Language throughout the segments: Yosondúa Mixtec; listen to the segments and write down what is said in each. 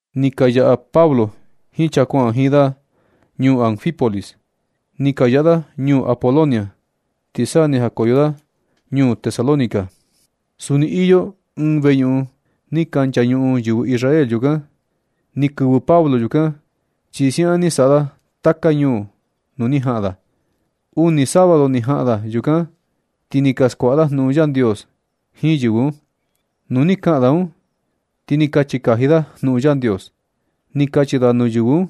Ni ka yaꞌa Pablo jiin chaa kuaꞌan jiin da ñuu Anfípolis, ni ka yaꞌa da ñuu Apolonia, ti sa ni jakoyo da ñuu Tesalónica. Suni iyo ɨɨn veñuꞌun ni ka nchañuꞌun yɨvɨ Israel yukan. Ni kɨvɨ Pablo yukan, chi siaꞌan ni saꞌa da taka ñuu nuu ni jaꞌan da. Uni sábado ni jaꞌan da yukan, ti ni ka skuaꞌa da jnuꞌun Yandios jiin yɨvɨ un. Nu ni kaꞌan da un, ti ni kachi kaji da jnuꞌun Yandios. Ni kachi da nuu yɨvɨ un: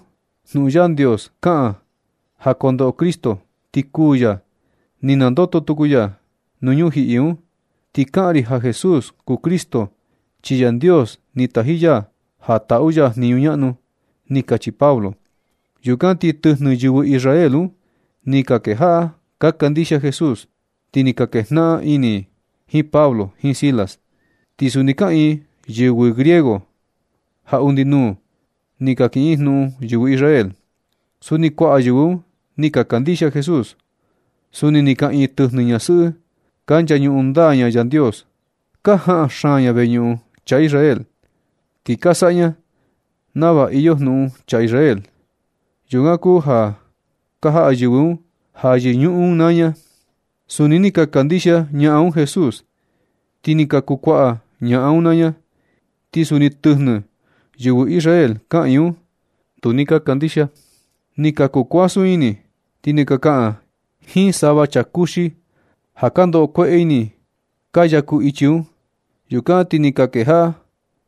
―Jnuꞌun Yandios kaꞌan ja kondoꞌo Cristo ti kuū ya, ti nandoto tuku ya nuu ñujiꞌi un. Ti kaꞌan ri ja Jesús kuu Cristo, chi Yandios ni taji ya ja taꞌu ya jniñu ñaꞌnu ―ni kachi Pablo. Yukan ti tɨjnɨ yɨvɨ Israel un, ni ka kejaꞌa ka kandixia Jesús, ti ni ka kejnaꞌan ini i jiin Pablo jiin Silas. Ti suni kaꞌiin yɨvɨ griego ja undi nuu ni ka kiꞌin jnuꞌun yɨvɨ Israel. Suni kuaꞌa yɨvɨ un ni ka kandixia Jesús. Suni ni kaꞌiin tɨjnɨ ñasɨꞌɨ ka nchañuꞌun ndaa Yandios. Ka jaꞌan xaan ña veñuꞌun chaa Israel, ti ka saꞌa ña nava iyo jnuꞌun chaa Israel. Yukan kuu ja ka jaꞌa yɨvɨ un ja yɨñuꞌun ña naa ña. Suni ni ka kandixia ñaꞌan un Jesús, ti ni ka kuu kuaꞌa ñaꞌan un naa ña. Ti suni tɨjnɨ yɨvɨ Israel kaꞌiin un, tu ni ka kandixia. Ni ka kuu kuasun ini, ti ni ka kaꞌan jiin sava chaa kuxi ja ka ndoꞌo kueꞌe ini ka yaku ichi un. Yukan ti ni ka kejaꞌa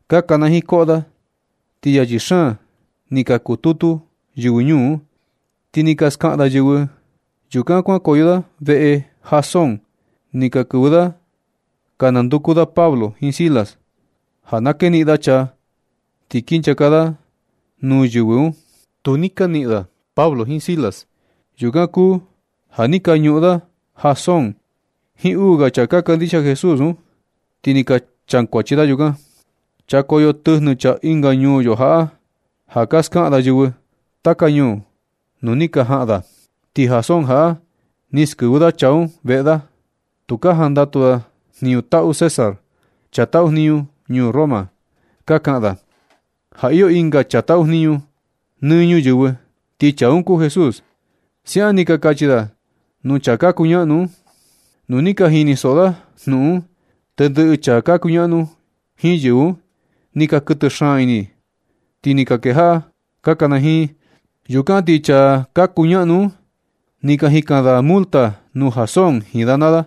ka kanajiin koꞌo da, ti yachi xaan ni ka kututu yɨvɨ ñuu un. Ti ni ka skaꞌan yɨvɨ un. Yukan kuankoyo da veꞌe Jasón, ni ka kɨvɨ da ka nanduku da Pablo jiin Silas, ja na keniꞌin da chaa ti kinchaka da nuu yɨvɨ un. Tu ni ka niꞌin da Pablo jiin Silas. Yukan kuu ja ni ka ñuꞌun da Jasón jiin uu ga chaa ka kandixia Jesús un, ti ni ka chakuachi da yukan: ―Chakoyo tɨjnɨ chaa ɨnga ñuu yo jaꞌa ja ni ka skaꞌan da yɨvɨ taka ñuu nuu ni ka jaꞌan da. Ti Jasón jaꞌa ni skɨvɨ da chaa un veꞌe da. Tu ka jandatu da jniñu taꞌu César, chaa taꞌu jniñu ñuu Roma. Ka kaꞌan da ja iyo ɨnga chaa taꞌu jniñu nɨ ñuyɨvɨ. Ti chaa un kuu Jesús ―siaꞌan ni ka kachi da nuu chaa ka kuñaꞌnu un. Nu ni ka jinisoꞌo da jnuꞌun un, tendɨꞌɨ chaa ka kuñaꞌnu jiin yɨvɨ un, ni ka kuɨtɨ xaan ini, ti ni ka kejaꞌa ka kanajiin. Yukan ti chaa ka kuñaꞌnu un ni ka jikan da multa nuu Jasón jiin da naa da,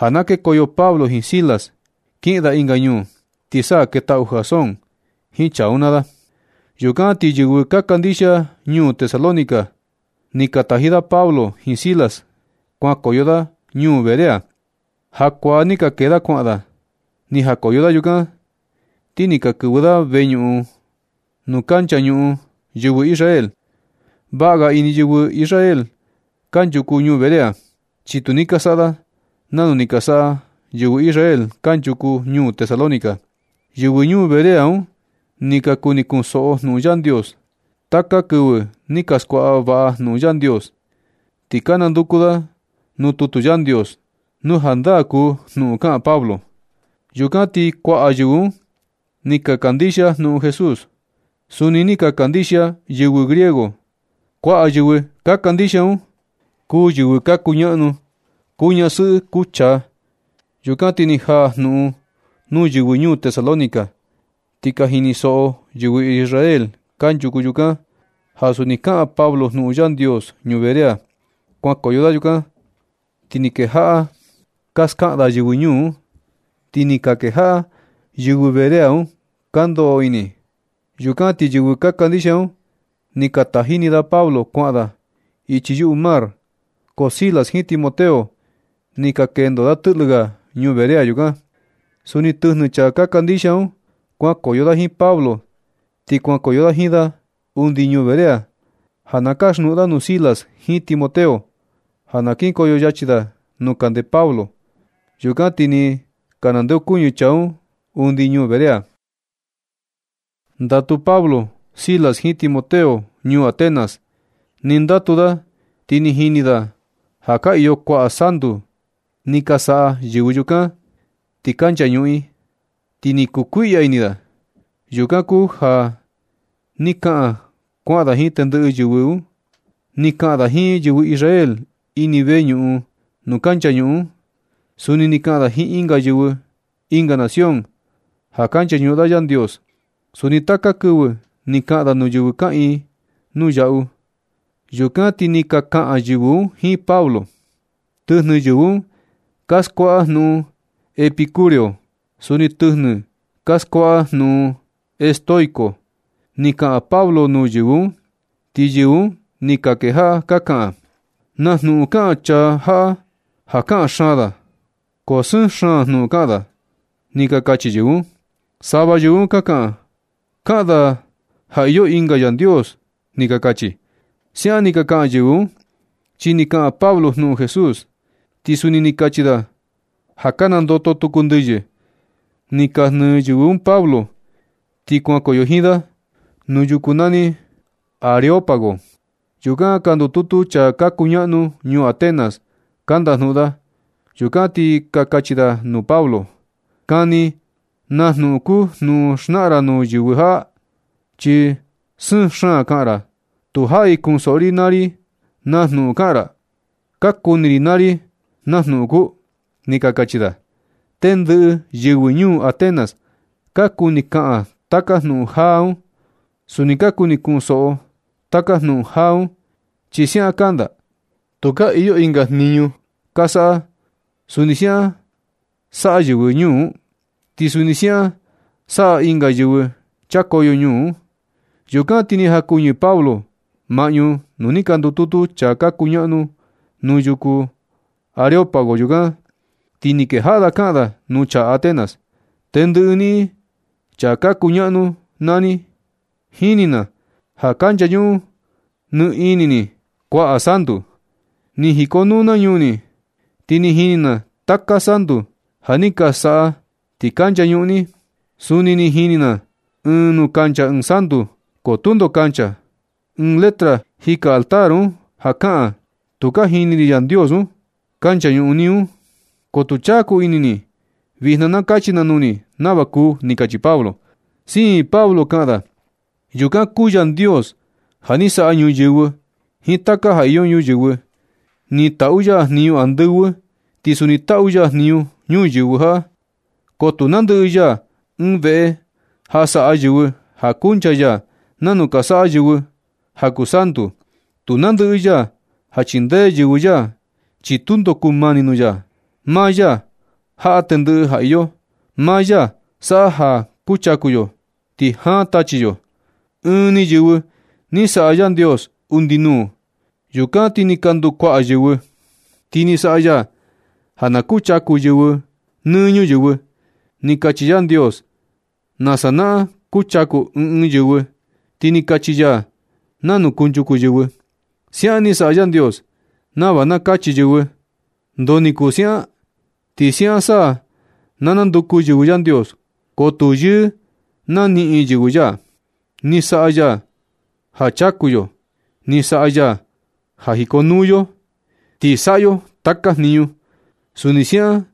ja na kekoyo Pablo jiin Silas kiꞌin da ɨnga ñuu, ti sa ni ketaꞌu Jasón jiin chaa un naa da. Yukan ti yɨvɨ ka kandixia ñuu Tesalónica ni ka taji da Pablo jiin Silas kuankoyo da ñuu Berea. Jakuaa ni ka kee da kuaꞌan da. Ni jakoyo da yukan, ti ni ka kɨvɨ da veñuꞌun nuu ka nchañuꞌun yɨvɨ Israel. Vaꞌa ga ini yɨvɨ Israel kanchuku ñuu Berea, chi tu ni ka saꞌa nanu ni ka saꞌa yɨvɨ Israel kanchuku ñuu Tesalónica. Yɨvɨ Berea un ni ka kuni kunshoꞌo jnuꞌun Yandios. Taka kɨvɨ ni ka skuaꞌa vaꞌa jnuꞌun Yandios, ti ka nanduku da nuu tutu Yandios nu jandaa kuu jnuꞌun kaꞌan Pablo. Yukan ti kuaꞌa yɨvɨ un, ni ka kandixia jnuꞌun Jesús. Suni ni ka kandixia yɨvɨ griego. Kuaꞌa yɨvɨ kuu kandixia un, kuu yɨvɨ ka un kuñaꞌnu. Kuu ñasɨꞌɨ kuu chaa. Yukan ti ni jaa jnuꞌun nuu yɨvɨ ñuu Tesalónica, ti ka jinisoꞌo yɨvɨ Israel kanchuku yukan ja suni kaꞌan Pablo jnuꞌun Yandios ñuu Berea. Kuankoyo da yukan ti ni kejaꞌa ka skaꞌan da yɨvɨ ñuu un, ti ni ka kejaꞌa yɨvɨ Berea un ka ndoꞌo ini. Yukan ti yɨvɨ ka kandixia un ni ka taji ni da Pablo kuaꞌan da ichi yuꞌu mar un, ko Silas jiin Timoteo ni ka kendo da tɨꞌlɨ ga ñuu Berea yukan. Suni tɨjnɨ chaa ka kandixia un kuankoyo da jiin Pablo, ti kuankoyo da jiin da undi ñuu Berea ja na kasjnuꞌun da nuu Silas jiin Timoteo ja na kinkoyo yachi da nuu kande Pablo. Yukan ti ni ka nandeokuñɨ chaa un undi ñuu Berea. Ndatu Pablo, Silas jiin Timoteo ñuu Atenas. Nɨ ndatu da, ti ni jini da ja ka iyo kuaꞌa santu ni ka saꞌa yɨvɨ yukan ti ka nchañuꞌun i, ti ni kukuiꞌya ini da. Yukan kuu ja ni kaꞌan kuaꞌa da jiin tendɨꞌɨ yɨvɨ un. Ni kaꞌan da jiin yɨvɨ Israel ini veñuꞌun nuu ka nchañuꞌun. Suni ni kaꞌan da jiin yɨvɨ ɨnga nación ja ka nchañuꞌun da Yandios. Suni taka kɨvɨ ni kaꞌan da nuu yɨvɨ kaꞌiin nuu yaꞌu. Yukan ti ni ka kaꞌan yɨvɨ un jiin Pablo. Tɨjnɨ yɨvɨ un ka skuaꞌa jnuꞌun epicúreo, suni tɨjnɨ ka skuaꞌa jnuꞌun estoico. Ni kaꞌan Pablo nuu yɨvɨ un, ti yɨvɨ un ni ka kejaꞌa ka kaꞌan: ―¡Naa jnuꞌun kaꞌan chaa jaꞌa ja kaꞌan xaan da, ko sɨɨn xaan jnuꞌun kaꞌan da! ―ni ka kachi yɨvɨ un. Sava yɨvɨ un ka kaꞌan: ―Kaꞌan da ja iyo ɨnga Yandios ―ni ka kachi. Siaꞌan ni ka kaꞌan yɨvɨ un, chi ni kaꞌan Pablo jnuꞌun Jesús, ti suni ni kachi da ja ka nandoto tuku ndɨyɨ. Ni ka jnɨ yɨvɨ un Pablo, ti kuankoyo jiin da nuu yuku nani Areópago. Yukan ka ndututu chaa ka kuñaꞌnu ñuu Atenas ka ndajnuꞌun da. Yukan ti ka kachi da nuu Pablo: ―Kani na jnuꞌun kuu jnuꞌun xnaꞌan ra nuu yɨvɨ jaꞌa, chi sɨɨn xaan kaꞌan ra. Tu jaꞌi kunsoꞌo ri naa ri na jnuꞌun kaꞌan ra. Ka kuni ri naa ri na jnuꞌun kuu ―ni ka kachi da. Tendɨꞌɨ yɨvɨ ñuu Atenas ka kuni kaꞌan taka jnuꞌun jaa un. Suni ka kuni kunsoꞌo taka jnuꞌun jaa un, chi siaꞌan kanda. Tukaa iyo ɨnga jniñu ka saꞌa. Suni siaꞌan saꞌa yɨvɨ ñuu un, ti suni siaꞌan saꞌa ɨnga yɨvɨ chakoyo ñuu un. Yukan ti ni jakuɨñɨ Pablo maꞌñu nuu ni ka ndututu chaa ka kuñaꞌnu nuu yuku Areópago yukan, ti ni kejaꞌa kaꞌa da nuu chaa Atenas: ―Tendɨꞌɨ niꞌin, chaa ka kuñaꞌnu naa ni, jini na ja ka nchañuꞌun nɨ ini ni kuaꞌa santu. Ni jikonuu na ñuu ni, ti ni jini na taka santu ja ni ka saꞌa, ti ka nchañuꞌun ni. Suni ni jini na ɨɨn nuu kuncha ɨɨn santu, ko tundo kancha. Ɨɨn letra jika altar un ja kaꞌan: “Tu ka jini ri Yandios un.” Ka nchañuꞌun ni un, ko tu chaku ini ni. Vijna na kachi na nuu ni nava kuu ―ni kachi Pablo. Siin Pablo kaꞌan da: ―Yukan kuu Yandios ja ni saꞌa ñuyɨvɨ jiin taka ja iyo ñuyɨvɨ. Ni taꞌu ya jniñu andɨvɨ, ti suni ni taꞌu ya jniñu ñuyɨvɨ jaꞌa, ko tu nandɨꞌɨ ya ɨɨn veꞌe ja saꞌa yɨvɨ ja kuncha ya, nanu ka saꞌa yɨvɨ ja kuu santu. Tu nandɨꞌɨ ya ja chindee yɨvɨ ya, chi tundo kumani nuu ya. Maa ya jaꞌa tendɨꞌɨ ja iyo. Maa ya saꞌa ja ka chaku yo, ti jaan tachi yo. Ɨɨn ni yɨvɨ ni saꞌa Yandios undi nuu. Yukan ti ni ka nduu kuaꞌa yɨvɨ, ti ni saꞌa ya ja na kuchaku yɨvɨ nɨ ñuyɨvɨ. Ni kachi Yandios nasa naꞌan kuchaku ɨɨn ɨɨn yɨvɨ, ti ni kachi ya nanu kunchuku yɨvɨ. Siaꞌan ni saꞌa Yandios nava na kachi yɨvɨ: “¿Ndoo ni kuu siaꞌan? Ti siaꞌan sa na nanduku yɨvɨ Yandios, ko tu yɨɨ naniꞌin yɨvɨ ya.” Ni saꞌa ya ja chaku yo. Ni saꞌa ya ja jikonuu yo, ti saꞌa yo taka jniñu. Suni siaꞌan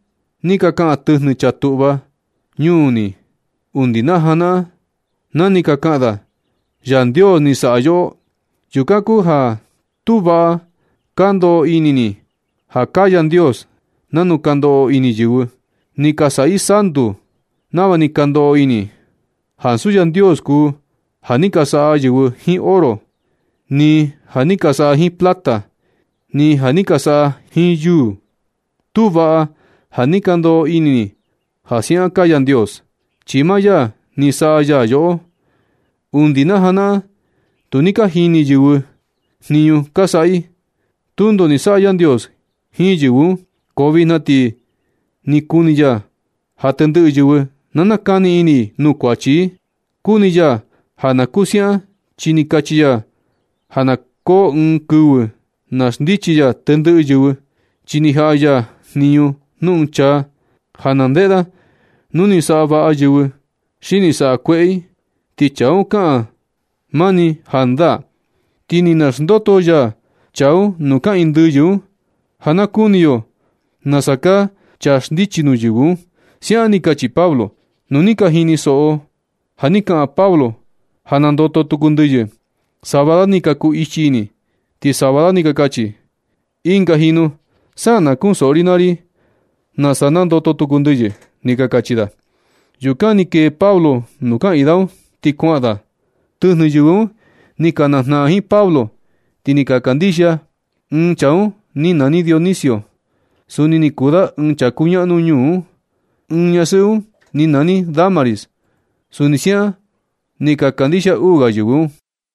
ni ka kaꞌan tɨjnɨ chaa tuꞌva ñuu ni undi najanaꞌan na ni ka kaꞌan da: “Yandios ni saꞌa yoꞌo.” Yukan kuu ja tu vaꞌa ka ndoꞌo ini ni ja kaa Yandios nanu ka ndoꞌo ini yɨvɨ. Ni ka saꞌa i santu nava ni ka ndoꞌo ini i, ansu Yandios kuu ja ni ka saꞌa yɨvɨ jiin oro, ni ja ni ka saꞌa jiin plata, ni ja ni ka saꞌa jiin yuu. Tu vaꞌa ja ni ka ndoꞌo ini ni ja siaꞌan kaa Yandios, chi maa ya ni saꞌa yoꞌo. Undi najanaꞌan tu ni ka jini yɨvɨ jniñu ka saꞌa i. Tundo ni saꞌa Yandios jiin yɨvɨ un, ko vijna ti ni kuni ya ja tendɨꞌɨ yɨvɨ na nakani ini i nuu kuachi i. Kuni ya ja na kuu siaꞌan, chi ni kachi ya ja na koo ɨɨn kɨvɨ na xndichi ya tendɨꞌɨ yɨvɨ, chi ni jaꞌa ya jniñu nuu ɨɨn chaa ja na ndeꞌe da nu ni saꞌa vaꞌa yɨvɨ, xi ni saꞌa kueꞌe i, ti chaa un kaꞌan da mani jandaa. Ti ni naxndoto ya chaa un nuu kaꞌiin ndɨyɨ un ja nakuni yo na kaa chaa xndichi nuu yɨvɨ un ―siaꞌan ni kachi Pablo. Nu ni ka jinisoꞌo ja ni kaꞌan Pablo ja nandoto tuku ndɨyɨ, sava da ni ka kuu ichi ini, ti sava da ni ka kachi: ―Ɨnga jinu sa na kunsoꞌo ri naa ri nasa nandoto tuku ndɨyɨ ―ni ka kachi da. Yukan ni kee Pablo nuu kaꞌiin da un, ti kuaꞌan da. Tɨjnɨ yɨvɨ un ni ka najnaꞌan jiin Pablo, ti ni ka kandixia. Ɨɨn chaa un ni nani Dionisio. Suni ni kuu da ɨɨn chaa kuñaꞌnu ñuu un. Ɨɨn ñasɨꞌɨ un ni nani Dámaris. Suni siaꞌan ni ka kandixia uu ga yɨvɨ un.